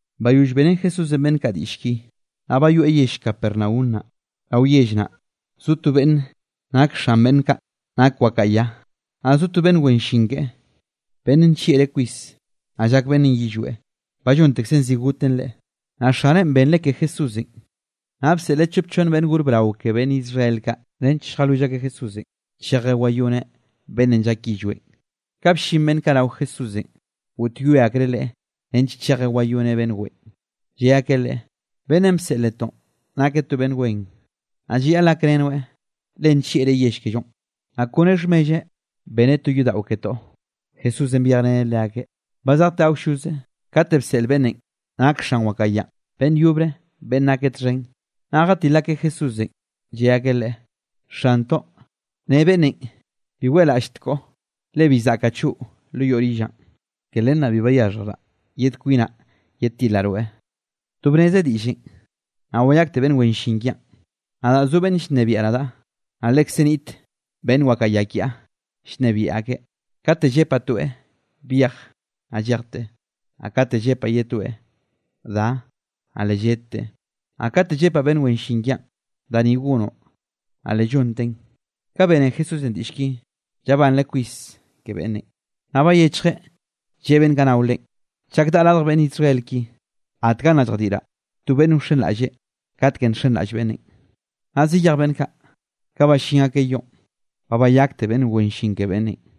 Bayoll beꞌrén Jesúsenꞌ beꞌnn kaꞌ diꞌll ki, naꞌ bayoeꞌ yell Capernaum naꞌ. Rao yell naꞌ zo to beꞌnn nak xan beꞌnn kaꞌ, nak wakaꞌa ya, naꞌ zo to beꞌnn wen llin keꞌe beꞌnn nllieꞌreꞌ kwis, naꞌ llak beꞌnnenꞌ yillweꞌ, ba llontekzen zi goten leꞌe. Naꞌ xaneꞌn benreꞌ ke Jesúsenꞌ, naꞌ bseꞌleꞌ chop chonn beꞌnn gor brao ke beꞌnn Israel kaꞌ, nench lljalwill akeꞌ Jesúsenꞌ, chejeꞌ wayoneꞌ beꞌnnenꞌ llak yillweꞌn. Ka bllin beꞌnn kaꞌ rao Jesúsenꞌ, goꞌtyoe akreꞌ Leꞌe nench chejeꞌ wayoneꞌ beꞌnn weꞌen, lle akeꞌ Leꞌe: —Beꞌnnenꞌ bseꞌl netoꞌ nakeꞌ to beꞌnn wen, naꞌ llayaꞌl gakrenoeꞌ, le nllieꞌreꞌ yell kellonꞌ, naꞌ kone xhmelleꞌ beneꞌ to yodaꞌo ketoꞌ. Jesúsenꞌ byejreneꞌ leakeꞌ, ba zejteꞌ awlloze, kate bseꞌl beꞌnnenꞌ nak xan wakaꞌa yanꞌ, beꞌnn yobre beꞌnn nakeꞌ txhen, naꞌ jatil akeꞌ Jesúsenꞌ, lle akeꞌ Leꞌe: —Xantoꞌ, ne beꞌnnenꞌ: “Bi weꞌlaꞌlltkoꞌ, le bi zaꞌkaꞌ choꞌo lo yoꞌ rillaꞌn. Ke len naꞌ bi bayaxhjraꞌ yed kwinaꞌ yedtilaꞌ rweꞌ. To bneze diꞌllenꞌ, naꞌ wayakte beꞌnn wen llin kiaꞌn. Nadaꞌ zo beꞌnn llnebiaꞌ nadaꞌ, naꞌ lekze niꞌt beꞌnn wakaꞌa ya kiaꞌ llnebiaꞌ akeꞌ. Kate llepaꞌ toeꞌ: Byej, naꞌ llejteꞌ, naꞌ kate llepaꞌ ye toeꞌ: Da, naꞌ le lledteꞌ, naꞌ kate llepaꞌ beꞌnn wen llin kiaꞌn: Da ni gonoꞌ, naꞌ le llonteꞌn.” Ka bene Jesúsenꞌ diꞌll ki, llabanreꞌ kwis ke beꞌnnenꞌ, naꞌ bayechjeꞌ, lleꞌe beꞌnn kaꞌ nao Leꞌen: —Chak daꞌa radj beꞌnn Israel ki, gatga nna lljadiꞌraꞌ to beꞌnn wxenraꞌlle katkenꞌ nxenraꞌll beꞌnnenꞌ. Naꞌ zayej beꞌnn kaꞌ, ka ballín akeꞌ yoꞌn, ba bayakte beꞌnn wen llin ke beꞌnnenꞌ.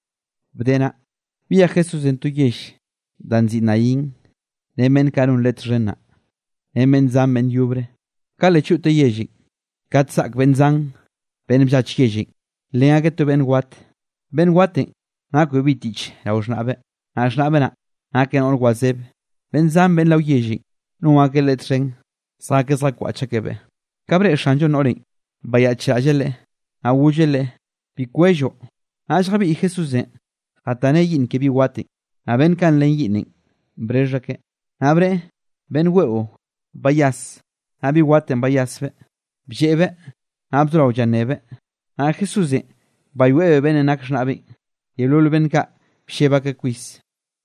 Bde naꞌ, byej Jesúsenꞌ to yell da nziꞌi Naín ren beꞌnn kaꞌ non Leꞌe txhen naꞌ, ren beꞌnn zan beꞌnn yobre. Ka le choꞌteꞌ yellenꞌ, kate zaꞌk beꞌnn zan beꞌnn bllach yellenꞌ, nlen akeꞌ to beꞌnn wat, beꞌnn watenꞌ nakbeꞌ bi tiꞌch rao xhnaꞌbeꞌ, naꞌ xhnaꞌbeꞌ naꞌ nakeꞌ noꞌr wazeb. Beꞌnn zan beꞌnn rao yellenꞌ, non akeꞌ leꞌe txhen zjakeꞌ zjakwaꞌch akebeꞌ. Ka breꞌe Xanllonꞌ noꞌrenꞌ, bayaꞌchraꞌlleꞌ leꞌe, naꞌ golleꞌ leꞌe: —Bi kwelloꞌ. Naꞌll jabiꞌy Jesúsenꞌ jataneꞌ yiꞌnn ke bi watenꞌ, naꞌ beꞌnn kaꞌ nlen yiꞌnnenꞌ brexh akeꞌ. Naꞌ bneꞌe: —Beꞌnn weꞌo, bayas. Naꞌ bi watenꞌ bayasbeꞌ, blleꞌbeꞌ, naꞌ bzorao llannebeꞌ, naꞌ Jesúsenꞌ bayoeꞌbeꞌ beꞌnnenꞌ nak xhnaꞌbeꞌn. Yeolol beꞌnn kaꞌ blleb akeꞌ kwis,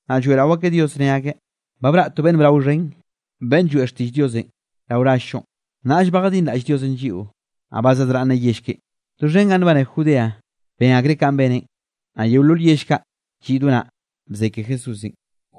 naꞌ lloeꞌrao akeꞌ Dios ne akeꞌ: —Ba braꞌ to beꞌnn brao xhen, beꞌnn lloeꞌ xtiꞌll Diosenꞌ rao rall-llonꞌ, nnaꞌll ba jadinraꞌll Diosenꞌ lliꞌo, naꞌ ba zadraꞌnneꞌ yell keꞌen. Doxhen ganꞌ nbane Judeanꞌ ben akreꞌ kanꞌ beneꞌn, naꞌ yeolol yell kaꞌ lliꞌ do naꞌ, bze ke Jesúsenꞌ.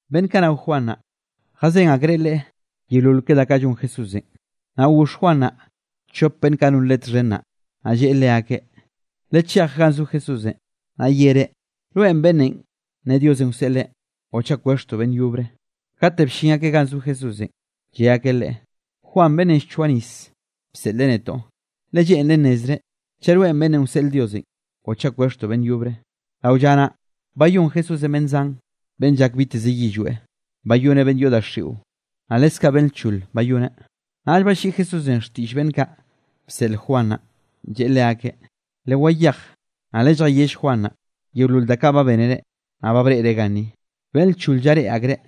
Beꞌnn kaꞌ nao Juan naꞌ, jazén akreꞌ leꞌe yeolol ke da kaꞌ llon Jesúsenꞌ. Naꞌ goxh Juan naꞌ, chop beꞌnn kaꞌ non leꞌe txhen naꞌ. Naꞌ lleꞌe leakeꞌ: —Lechej ganꞌ zo Jesúsenꞌ, naꞌ yereꞌ: “¿Rweꞌn beꞌnnenꞌ ne Diosenꞌ wseꞌleꞌ o chaꞌ kwexhtoꞌ beꞌnn yobre?” Kate bllin akeꞌ ganꞌ zo Jesúsenꞌ, lle akeꞌ Leꞌe: —Juan beꞌnnenꞌ llchoaꞌ nis, bseꞌleꞌ netoꞌ, le lleꞌnreꞌ nnezreꞌ chaꞌ rweꞌn beꞌnnenꞌ wseꞌl Diosenꞌ o chaꞌ kwexhtoꞌ beꞌnn yobre. Rao lla naꞌ, bayón Jesúsenꞌ beꞌnn zan beꞌnn llak biteze yillweꞌ. Bayoneꞌ beꞌnn yoꞌ daxiꞌo, naꞌ leskaꞌ beꞌnn lchol bayoneꞌ. Naꞌll balliꞌi Jesúsenꞌ xtiꞌll beꞌnn kaꞌ bseꞌl Juan naꞌ, lleꞌe leakeꞌ: —Lewayej, naꞌ lelljayell Juan naꞌ, yeolol da kaꞌ ba bénere, naꞌ ba breꞌre ganni: beꞌnn lchol llareꞌe akreꞌ,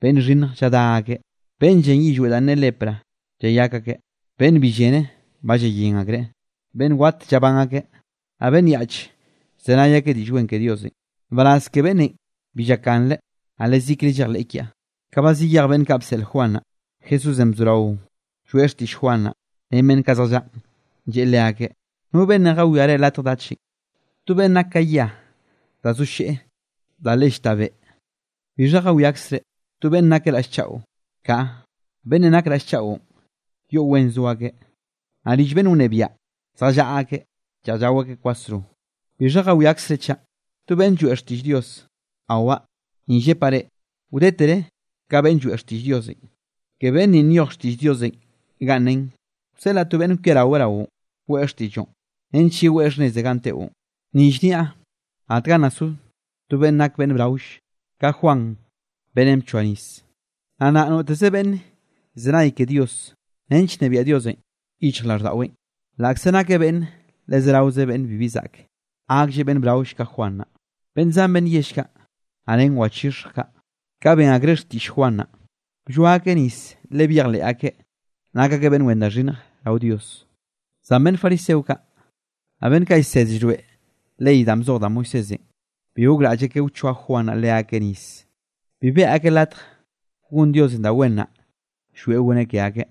beꞌnn xhinnj lladá akeꞌ, beꞌnn llen yillweꞌ danꞌ ne lepra llayak akeꞌ, beꞌnn bi llene ba llayén akreꞌ, beꞌnn wat llabán akeꞌ, naꞌ beꞌnn yaꞌch llzenay akeꞌ Diꞌll Wen ke Diosenꞌ. ¡Nbaraz ke beꞌnnenꞌ bi llakganreꞌ, naꞌ yezikre llejleꞌ kiaꞌ! Ka ba zayej beꞌnn kaꞌ bseꞌl Juan naꞌ, Jesúsenꞌ bzorao lloeꞌ xtiꞌll Juan naꞌ, ren beꞌnn kaꞌ zjallaꞌn, lleꞌe leakeꞌ: —¿No beꞌnnenꞌ jawiare latj dachenꞌ? ¿To beꞌnn nak ka yia da zo lleꞌ da le llta beꞌ? ¿Bixha jawiakzre? ¿To beꞌnn nakeꞌ raꞌll chaꞌo? Kaꞌa, beꞌnn nakeꞌ raꞌll chaꞌon, yoꞌ wen zo akeꞌ, naꞌ rill beꞌnn llnebiaꞌ zjallaꞌa akeꞌ lleꞌj llao akeꞌ kwasro. ¿Bixha jawiakzre chaꞌ? ¿To beꞌnn lloeꞌ xtiꞌll Dios? Awaꞌ, ni llepaꞌ reꞌ, wdetere ka beꞌnn lloeꞌ xtiꞌll Diosenꞌ. Ke beꞌnn ninꞌ nyoj xtiꞌll Diosenꞌ ganꞌ nen: Wseꞌlaꞌ to beꞌnn kwiaraweꞌ raoꞌn, weꞌe xtiꞌlloꞌn, nench yeweꞌ xhnneze ganꞌ teꞌon. Ni llniaꞌ, gatga nna so to beꞌnn nak beꞌnn braoll, ka Juan beꞌnnenꞌ bchoa nisenꞌ. Naꞌ nnaꞌ noteze beꞌnn llzenay ke Dios, nench nnebiaꞌ Diosenꞌ yichjraꞌlldaꞌweꞌn, laꞌkze nakeꞌ beꞌnne le zeraoze beꞌnne bibi zaꞌke, gaklleꞌ beꞌnn braoll ka Juan naꞌ. Beꞌnn zan beꞌnn yell, naꞌ ren wachixhj kaꞌ, ka ben akreꞌ xtiꞌll Juan naꞌ, blloa akeꞌ nis le byejnieꞌ akreꞌ nak akeꞌ beꞌnn wen da xhinnj rao Dios. Zan beꞌnn fariseo kaꞌ, naꞌ beꞌnn kaꞌ llsed llroeꞌ ley danꞌ bzoj da Moisésenꞌ, bi gokraꞌll akeꞌ wchoa Juan naꞌ leakeꞌ nis, bi beꞌe akeꞌ latj gon Diosenꞌ da wen naꞌ llwieꞌ goneꞌ ke akeꞌ.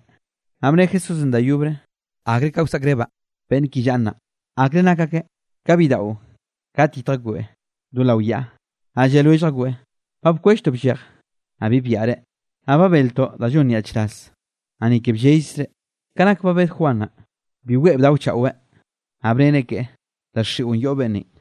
Naꞌ bne Jesúsenꞌ da yobre: —¿Akre ka wsaꞌkrebaꞌ beꞌnn ki llaꞌa nnaꞌ? ¿Akre nak akeꞌ? Ka bidaꞌo kate yitj akbeꞌ do lao yaꞌa, naꞌ lle lwellj akbeꞌ: “Ba bkwelltoꞌ bllej, naꞌ bi byaꞌre, naꞌ ba beltoꞌ da llon nyaꞌchraz, naꞌ ni ke bllellzre.” Ka nak ba bed Juan naꞌ, bi weꞌe bdaochaꞌweꞌ, naꞌ bnere keꞌe: “Daxiꞌon yoꞌ beꞌnnenꞌ.”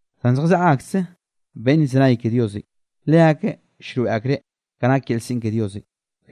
Zan zjallaꞌa akse beꞌnn llzenay ke Diosenꞌ. Leakeꞌ llroeꞌ akreꞌ kanꞌ nak yel siꞌn ke Diosenꞌ.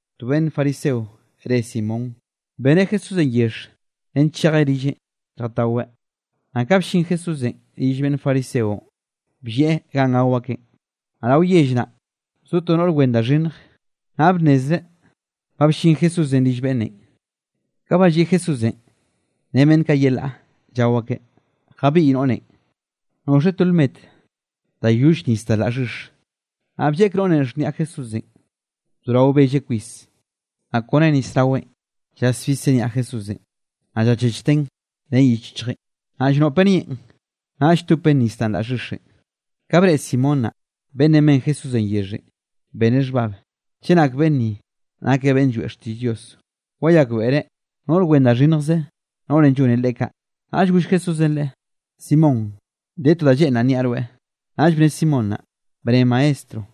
To beꞌnn fariseo re Simón, beneꞌ Jesúsenꞌ yexh nench chejeꞌ rilleꞌn lljataweꞌ, naꞌ ka bllin Jesúsenꞌ rill beꞌnn fariseonꞌ, bllieꞌ ganꞌ gao akeꞌn. Naꞌ rao yell naꞌ, zo to noꞌr wen da xhinnj, naꞌ bnnezreꞌ ka bllin Jesúsenꞌ rill beꞌnnenꞌ. Ka ba lliꞌ Jesúsenꞌ ren beꞌnn kaꞌ yelaꞌ llao akeꞌ, jabiꞌy noꞌrenꞌ noꞌxeꞌ to lmet da yoll nis da laꞌ xhix. Naꞌ blleꞌk noꞌrenꞌ xhniaꞌ Jesúsenꞌ, bzorao belleꞌ kwis, naꞌ kone nis raweꞌn, llasbiseꞌ niaꞌ Jesúsenꞌ, naꞌ llachechteꞌn ren yich yichjeꞌ, naꞌ llnoꞌpeꞌ nieꞌn, naꞌll lltopteꞌn nis danꞌ la xhixenꞌ. Ka breꞌe Simón naꞌ, beꞌnnenꞌ ben Jesúsenꞌ yexhenꞌ, beneꞌ xhbab: “Chenak beꞌnn ni nakeꞌ beꞌnn lloeꞌ xtiꞌll Dios, wayakbeꞌreꞌ noꞌr wen da xhinnjze, noꞌrenꞌ llone leꞌe kaꞌ.” Naꞌll goll Jesúsenꞌ leꞌe: —Simón, de to da lleꞌnraꞌ nniaꞌ rweꞌ. Naꞌll bne Simón naꞌ: —Bne, maestro.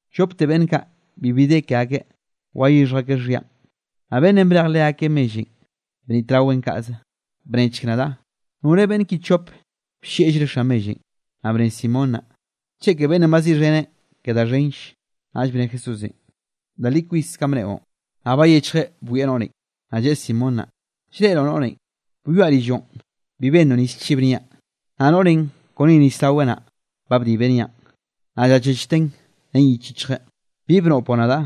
Llopte beꞌnn kaꞌ bibi de ke akeꞌ wayixhj akeꞌ xhianꞌ, naꞌ beꞌnnenꞌ brej leakeꞌ mellenꞌ, bnitraweꞌn kaꞌze. Bnechk nadaꞌ, ¿nore beꞌnn ki chop bllieꞌllreꞌ xan mellenꞌ? Naꞌ bne Simón naꞌ: —Cheke beꞌnnenꞌ baziꞌxheneꞌ ke da xhenll. Naꞌll bne Jesúsenꞌ: —Da li kwis kanꞌ bneꞌon. Naꞌll bayechjeꞌ bwieꞌ noꞌrenꞌ, naꞌ lleꞌe Simón naꞌ: —¿Llreꞌroꞌ noꞌrenꞌ? Byoaꞌ rilloꞌn, bi bennoꞌ nis chib niaꞌ, naꞌ noꞌrenꞌ, kone nis raweꞌ naꞌ, ba bdibeꞌ niaꞌn, naꞌ llachechteꞌn ren yich yichjeꞌ. Bi bnoꞌpoꞌ nadaꞌ,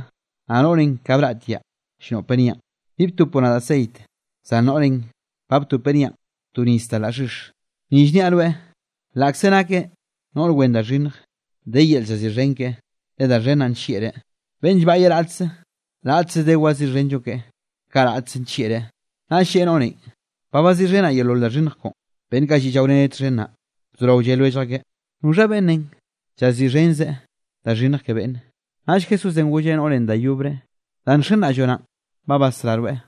naꞌ noꞌrenꞌ, ka braꞌtiaꞌ llnoꞌpeꞌ niaꞌn. Bi btopoꞌ nadaꞌ ceit, zan noꞌrenꞌ ba btopeꞌ niaꞌn to nis da laꞌ xhix. Ni llniaꞌ rweꞌ, laꞌkze nakeꞌ noꞌr wen da xhinnj, de yel llaziꞌxhen keꞌe, le da xhen naꞌ nllieꞌreꞌ. Beꞌnn llbaꞌyeꞌ raꞌtze, raꞌtze de waziꞌxhenllo keꞌe, kaꞌ raꞌtze nllieꞌreꞌ. Naꞌll lleꞌe noꞌrenꞌ: —Ba baziꞌxhenaꞌ yeolol da xhinnj koꞌon. Beꞌnn kaꞌ lliꞌ llaoreneꞌ txhen naꞌ, bzorao lle lwellj akeꞌ: —¿Noxha beꞌnnenꞌ llaziꞌxhenzeꞌ da xhinnj ke beꞌnne? Naꞌll Jesúsenꞌ golleꞌ noꞌrenꞌ da yobre: —Danꞌ nxenraꞌlloꞌ naꞌn ba basrá rweꞌ,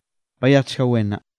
bayejchga wen nnaꞌ.